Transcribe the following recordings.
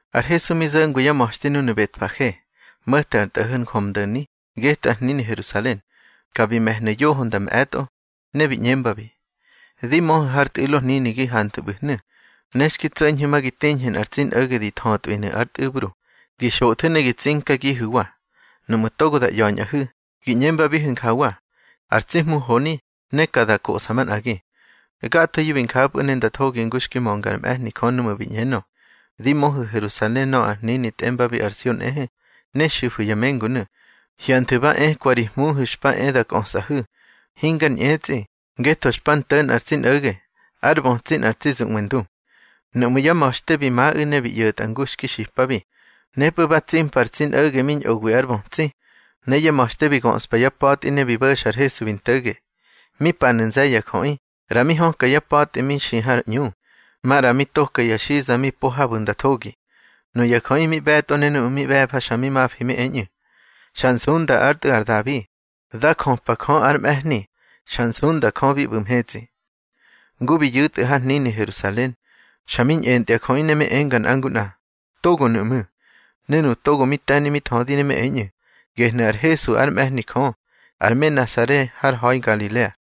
Ar Hesu mi zo̱ngwi yá ma̱xte núnu̱ Betfage, mo̱te ar tꞌo̱ho̱ Njömdo̱ni, getꞌu̱ ar hnini Herusalen. Ka bi me̱hnu̱ yoho nda mꞌe̱tꞌo. Ne bi ꞌñembabi: —Di möhu̱ har tꞌu̱lo hnini gi hanthu̱ ꞌbu̱hnu̱. Ne xki tso̱ñhu̱ ma gi tiñhu̱ nꞌar tsi nꞌo̱ge di thötwinu̱ ár tꞌu̱bru, gi xothu̱ ne gi tsinkagihu̱wa. Nuꞌmu̱ togo da ꞌya̱ñꞌahu̱, gi ꞌñembabihu̱ njawa: Ar tsi Hmu honi, ne ka da kosꞌa manꞌagi. Gathoyu̱ bi njapꞌu̱ ne nda thogi ngu xki mönga ár mꞌe̱hni Jö núꞌmu̱ bi ꞌñenö: Di möhu̱ Herusalen nöꞌö ar hnini tꞌembabi ar Sion nꞌehe, ne xifu̱ ya mengunu̱: Hyanthu̱ ba ekwa ri Hmuhu̱ xpa e da kꞌösꞌahu̱, hingar ñꞌetsꞌi, ngetho xpa nto̱ nꞌar tsi nꞌo̱ge, ár bötsi nꞌar tsi zuꞌwe ndu. Nuꞌmú̱ yá ma̱xte bi maꞌu̱ ne bi ꞌyo̱tꞌa ngu xki xipabi. Nepꞌu̱ ba tsimpa ar tsi nꞌo̱ge mi ñꞌowi ár bötsi, ne yá ma̱xte bi göꞌspa yá pa̱tꞌi ne bi bo̱xa ar Hesu bi nto̱ge. Mi panu̱ nze̱ye̱ ya jöꞌi, ꞌra mi höka yá pa̱tꞌi mi xi har ꞌñu, maꞌra mi toka ya xiza mi po habu̱ nda thogi. Nuya jöꞌi mi ꞌbe̱tꞌo ne nuꞌu̱ mi ꞌbe̱fa xa mi mafi mi eñꞌu̱: —Xa nsunda ár Tꞌu̱ ar Dabi. Dá jöpa Jö ár mꞌe̱hni. Xa nsunda Jö bi ꞌbu̱ mhetsꞌi. Ngu mi yu̱tꞌu̱ har hnini Herusalen, xa mi ñꞌentya jöꞌi ne mi enga nꞌa ngu nꞌa: —Togonu̱ ꞌmu̱. Ne nuꞌu̱ togo mi te̱ni mi thödi ne mi eñꞌu̱: —Gehnu̱ ar Hesu ár mꞌe̱hni Jö, ar me Nasare har ha̱i Ngalilea.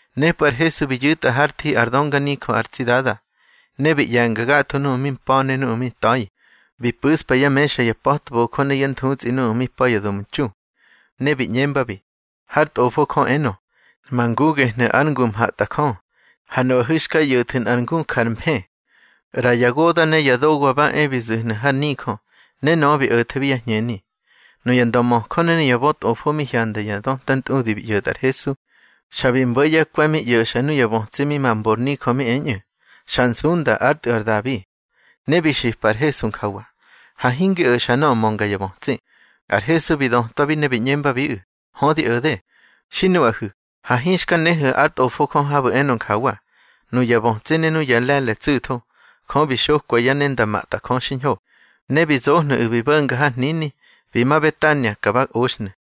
Nepꞌu̱ ar Hesu bi yu̱tꞌa hár thi ár dönganijö ar tsi Dada, ne bi ꞌye̱nga gatho nuꞌu̱ mi mpa̱ ne nuꞌu̱ mi nta̱i. Bi pu̱ꞌspa yá mexa ya pa̱tbojö ne yá nthutsꞌi nuꞌu̱ mi pa̱ ya domtxu. Ne bi ꞌñembabi: —Hár Tꞌofo Jö enö: Ma ngu gehnu̱ ár ngu mhatꞌajö. Ha nuꞌahu̱ xka ꞌyo̱thu̱ nꞌar ngu jar mfë. ꞌRa ya goda̱ ne ya dowa ba e bi zu̱hnu̱ har nijö, ne nöꞌö bi o̱thebi yá hñeni. Nuya ndömöjö ne nuya bötꞌofo mi hyanda ya döta ntꞌudi bi ꞌyo̱tꞌa ar Hesu, xa bi mbo̱ yá kwe̱ mi ꞌyo̱xa nuya bötsi mi ma mbor nijö mi eñꞌu̱: Xa nsunda ár Tꞌu̱ ar Dabi. Ne bi xipa ar Hesu njawa: —Ha hingi o̱xa nöꞌö mönga ya bötsi. Ar Hesu bi dötwabi ne bi ꞌñembabiꞌu̱: —Hö, di o̱de. Xi nuꞌahu̱, ha hinxka nehu̱ ár Tꞌofo Jö habu̱ enö njawa: Nuya bötsi ne nuꞌu̱ ya le̱le̱ tsu̱tho, Jö bi xokwa yá ne nda matꞌajö xiñho. Ne bi zohnu̱ꞌu̱ bi bo̱nga har hnini, bi ma Betania, ka ba oxhnu̱.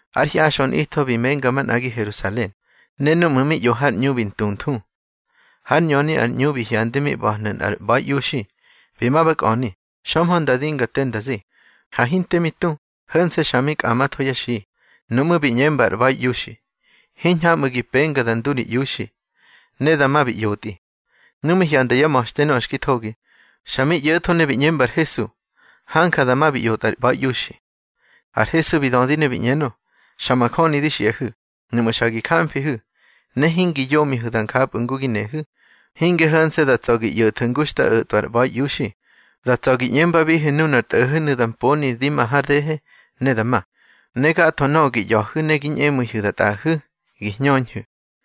Ár hyaxꞌö nꞌitho bi menga manꞌagi Herusalen, ne núꞌmu̱ mi ꞌyo har ꞌñu bi ntunthu. Hár ñöni ar ꞌñu bi hyandi mi ꞌba̱hnu̱ nꞌar ꞌba̱iꞌiuxi. Bi ma ba kꞌöni, xömhö nda dinga te nda zi. Ha hinte mi tu, ho̱nse̱ xa mi kꞌamatho yá xi. Nuꞌmú̱ bi ꞌñemba ar ꞌba̱iꞌiuxi: —Hiñhamꞌu̱ gi penga da ndu ri iuxi. Ne dama bi ꞌyotꞌi. Nu mi hyanda yá ma̱xte nöꞌö xki thogi, xa mi ꞌyo̱tho ne bi ꞌñemba ar Hesu: —Hanja dama bi ꞌyotꞌa ar ꞌba̱iꞌiuxi. Ar Hesu bi dödi ne bi ꞌñenö: —Xa majöni di xiꞌahu̱, nuꞌmu̱ xa gi jamfihu̱, ne hingi yomihu̱ da njapꞌu̱ ngu gi nehu̱, hinge ho̱nse̱ da tsa̱ gi ꞌyo̱thu̱ ngu xta o̱tꞌwa ar ꞌba̱iꞌiuxi. Da tsa̱ gi ꞌñembabihu̱ nunar tꞌo̱ho̱nu̱ da mponi di ma har dehe, ne da ma. Ne gatho nöꞌö gi ꞌya̱hu̱ ne gi ñꞌemu̱ihu̱ da tꞌaꞌahu̱, gi hñöhu̱.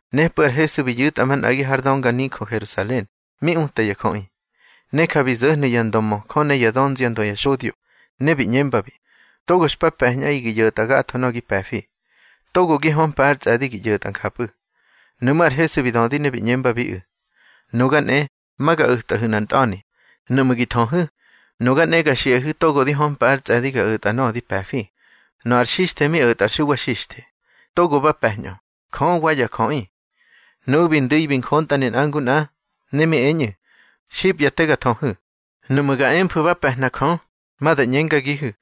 Nepꞌu̱ ar Hesu bi yu̱tꞌa manꞌagi har dönganijö Herusalen, mi uta ya jöꞌi. Ne ja bi zo̱hnu̱ ya ndömöjö ne yá dönziandö ya xodyo, ne bi ꞌñembabi: —Togo xpa pe̱ñꞌaꞌi gi ꞌyo̱tꞌa gatho nöꞌö gi pe̱fi. Togo gi hömpa ár tsꞌe̱di gi ꞌyo̱tꞌa njapꞌu̱. Nuꞌmú̱ ar Hesu bi dödi ne bi ꞌñembabiꞌu̱: —Nuga nꞌe, ma ga o̱tꞌahu̱ nꞌar ntꞌa̱ni. Nuꞌmu̱ gi thöhu̱, nuga nꞌe ga xiꞌahu̱ togo di hömpa ár tsꞌe̱di ga o̱tꞌa nöꞌö di pe̱fi. Nöꞌö ar xixthe mi o̱tꞌa ar Xuwa Xixthe, togo ba pe̱ñꞌö, Jö wa ya jöꞌi. Nuꞌu̱ bi ndu̱i bi njontꞌane nꞌa ngu nꞌa, ne mi eñꞌu̱: —Xipya te ga thöhu̱. Nuꞌmu̱ ga emfu̱ ba pe̱hna Jö, ma da ꞌñengagihu̱: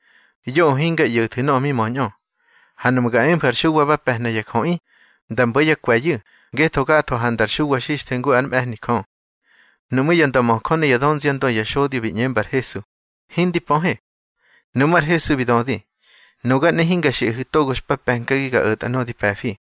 Yoꞌö hinga ꞌyo̱thu̱ nöꞌö mi möñꞌö. Ha nuꞌmu̱ ga emfu̱ ar Xuwa ba pe̱hna ya jöꞌi, da mbo̱ yá kwe̱yu̱, ngetho gatho handa ar Xuwa Xixthe ngu ár mꞌe̱hni Jö. Nuꞌmú̱ ya ndömöjö ne yá dönziandö ya xodyo bi ꞌñemba ar Hesu: —Hindi pöhe. Nuꞌmú̱ ar Hesu bi dödi: —Nuga nꞌe hinga xiꞌahu̱ togo xpa pe̱nkagi ga o̱tꞌa nöꞌö di pe̱fi.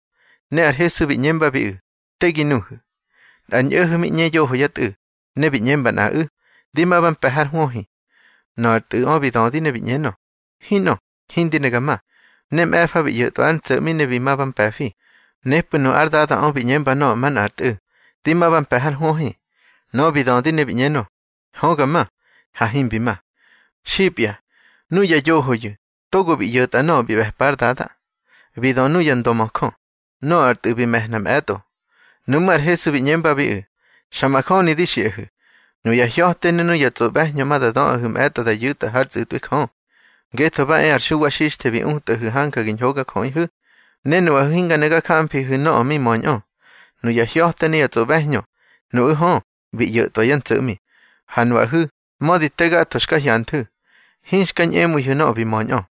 Ne ar Hesu bi ꞌñembabiꞌu̱: —Te gi nuhu̱. Nꞌar ñꞌo̱ho̱ mi ꞌñe yoho yá tꞌu̱, ne bi ꞌñemba nꞌaꞌu̱: Di ma ba mpe̱ har hwöhi. Nöꞌö ar tꞌu̱ꞌö bi dödi ne bi ꞌñenö: Hinꞌö, hindi ne ga ma. Ne mꞌe̱fa bi ꞌyo̱tꞌwa ár ntso̱ꞌmi ne bi ma ba mpe̱fi. Nepꞌu̱ nu ár dadaꞌö bi ꞌñemba nöꞌö manꞌár tꞌu̱: Di ma ba mpe̱ har hwöhi. Nöꞌö bi dödi ne bi ꞌñenö: Hö, ga ma. Ha himbi ma. Xipya, nuya yohoyu̱, togo bi ꞌyo̱tꞌa nöꞌö bi ꞌbe̱pa ár dada. Bi dö nuya ndömöjö: —Nöꞌö ar tꞌu̱ bi me̱hna mꞌe̱tꞌo. Nuꞌmú̱ ar Hesu bi ꞌñembabiꞌu̱: —Xa majöni di xiꞌahu̱, nuya hya̱te ne nuya tsꞌoꞌbe̱hñö ma da döꞌahu̱ mꞌe̱tꞌo da yu̱tꞌa hár tsꞌu̱tꞌwi Jö. Ngetho ba e ar Xuwa Xixthe bi utꞌahu̱ hanja gi ñhogajöꞌihu̱, ne nuꞌahu̱ hinga ne ga jamfihu̱ nöꞌö mi möñꞌö. Nuya hya̱te ne ya tsꞌoꞌbe̱hñö, nuꞌu̱ hö, bi ꞌyo̱tꞌwa yá ntso̱ꞌmi. Ha nuꞌahu̱, mödi te gatho xka hyanthu̱, hinxka ñꞌemu̱ihu̱ nöꞌö bi möñꞌö.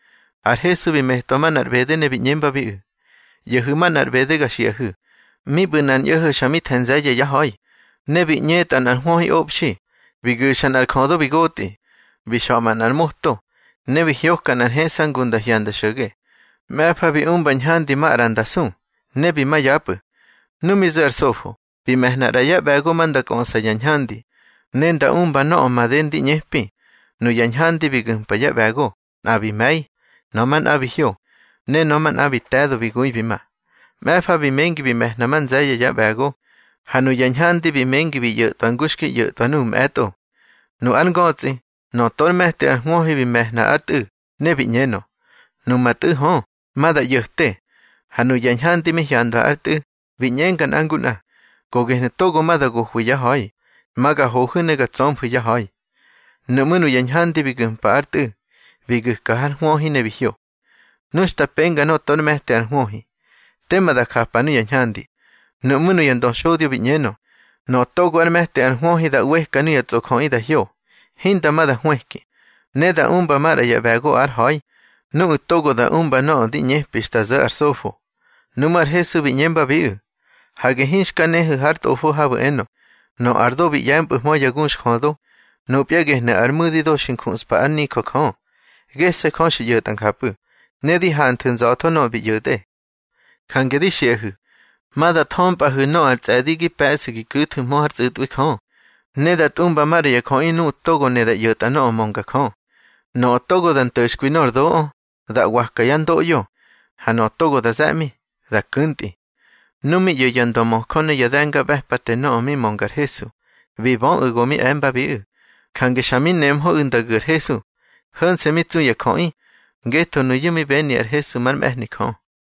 Ar Hesu bi metwa manꞌar ꞌbede ne bi ꞌñembabiꞌu̱: —ꞌYo̱hu̱ manꞌar ꞌbede ga xiꞌahu̱: Mi ꞌbu̱ nꞌar ñꞌo̱ho̱ xa mi the̱ nze̱ye̱ yá ha̱i. Ne bi ꞌñetꞌa nꞌar hwöhiꞌobxi, bi gu̱xa nꞌar jödo bi gotꞌi. Bi xa̱ꞌma nꞌar moto, ne bi hyoka nꞌar heꞌsa ngu nda hyanda xo̱ge. Mꞌe̱fa bi umba ñhandi maꞌra nda su, ne bi ma yapꞌu̱. Nu mi zo̱ ar sofo, bi me̱hna ꞌra yá ꞌbe̱go ma nda kꞌöꞌsa yá ñhandi, ne nda umba nöꞌö made ndi ꞌñepi. Nuya ñhandi bi gu̱mpa yá ꞌbe̱go, nꞌa bi me̱i, nöꞌö manꞌa bi hyo, ne nöꞌö manꞌa bi te̱do bi gui bi ma. Mꞌe̱fa bi mengi bi me̱hna ma nze̱ye̱ yá ꞌbe̱go, ha nuya ñhandi bi mengi bi ꞌyo̱tꞌwa ngu xki ꞌyo̱tꞌwa nuꞌu̱ mꞌe̱tꞌo. Nu ár ngötsꞌi, nöꞌö tor me̱ti ar hwöhi bi me̱hna ár tꞌu̱, ne bi ꞌñenö: Numa tꞌu̱ hö, ma da ꞌyo̱te. Ha nuya ñhandi mi hyandwa ár tꞌu̱, bi ꞌñenga nꞌa ngu nꞌa: Go gehnu̱ togo ma da gohwi ya ha̱i. Ma ga hohu̱ ne ga tsömfu̱ yá ha̱i. Nuꞌmú̱ nuya ñhandi bi gu̱mpa ár tꞌu̱, bi gu̱ka har hwöhi ne bi hyo. Nu xta penga nöꞌö tor me̱ti ar hwöhi, tema da japa nuya ñhandi. Nuꞌmú̱ nuya ndöxodyo bi ꞌñenö: —Nöꞌö togo ár me̱ti ar hwöhi da ꞌweka nuya tsꞌojöꞌi da hyo, hinda ma da hwëki. Ne da umba maꞌra ya ꞌbe̱go ár ha̱i, nuꞌu̱ togo da umba nöꞌö di ꞌñepi xta zo̱ ar sofo. Nuꞌmú̱ ar Hesu bi ꞌñembabiꞌu̱: —Hage hinxka nehu̱ har Tꞌofo habu̱ enö: Nöꞌö ar do bi ꞌye̱mpꞌu̱hmö ya guxjödo, nupya gehnu̱ ar mu̱di do xi njuꞌspa ár nijö Jö. Gese̱ Jö xi ꞌyo̱tꞌa njapꞌu̱, ne di hanthu̱ nza̱tho nöꞌö bi ꞌyo̱tꞌe. Jange di xiꞌahu̱, ma da thömpꞌahu̱ nöꞌö ar tsꞌe̱di gi pe̱ꞌsu̱ gi ku̱thu̱hmö hár tsꞌu̱tꞌwi Jö, ne da tꞌumba maꞌra ya jöꞌi nuꞌu̱ togo ne da ꞌyo̱ta nöꞌö mönga Jö. Nöꞌö togo da nto̱xkwi nor doꞌö, da ꞌwaka yá ndoꞌyo, ha nöꞌö togo da ze̱ꞌmi, da ku̱ntꞌi. Nu mi ꞌyo̱ ya ndömöjö ne ya de̱ngaꞌbe̱pate nöꞌö mi mönga ar Hesu, bi böꞌu̱ go mi e̱mbabiꞌu̱. Jange xa mi nemhöꞌu̱ nda gu̱ ar Hesu. Ho̱nse̱ mi tsu ya jöꞌi, ngetho nuyu̱ mi beni ar Hesu már mꞌe̱hni Jö.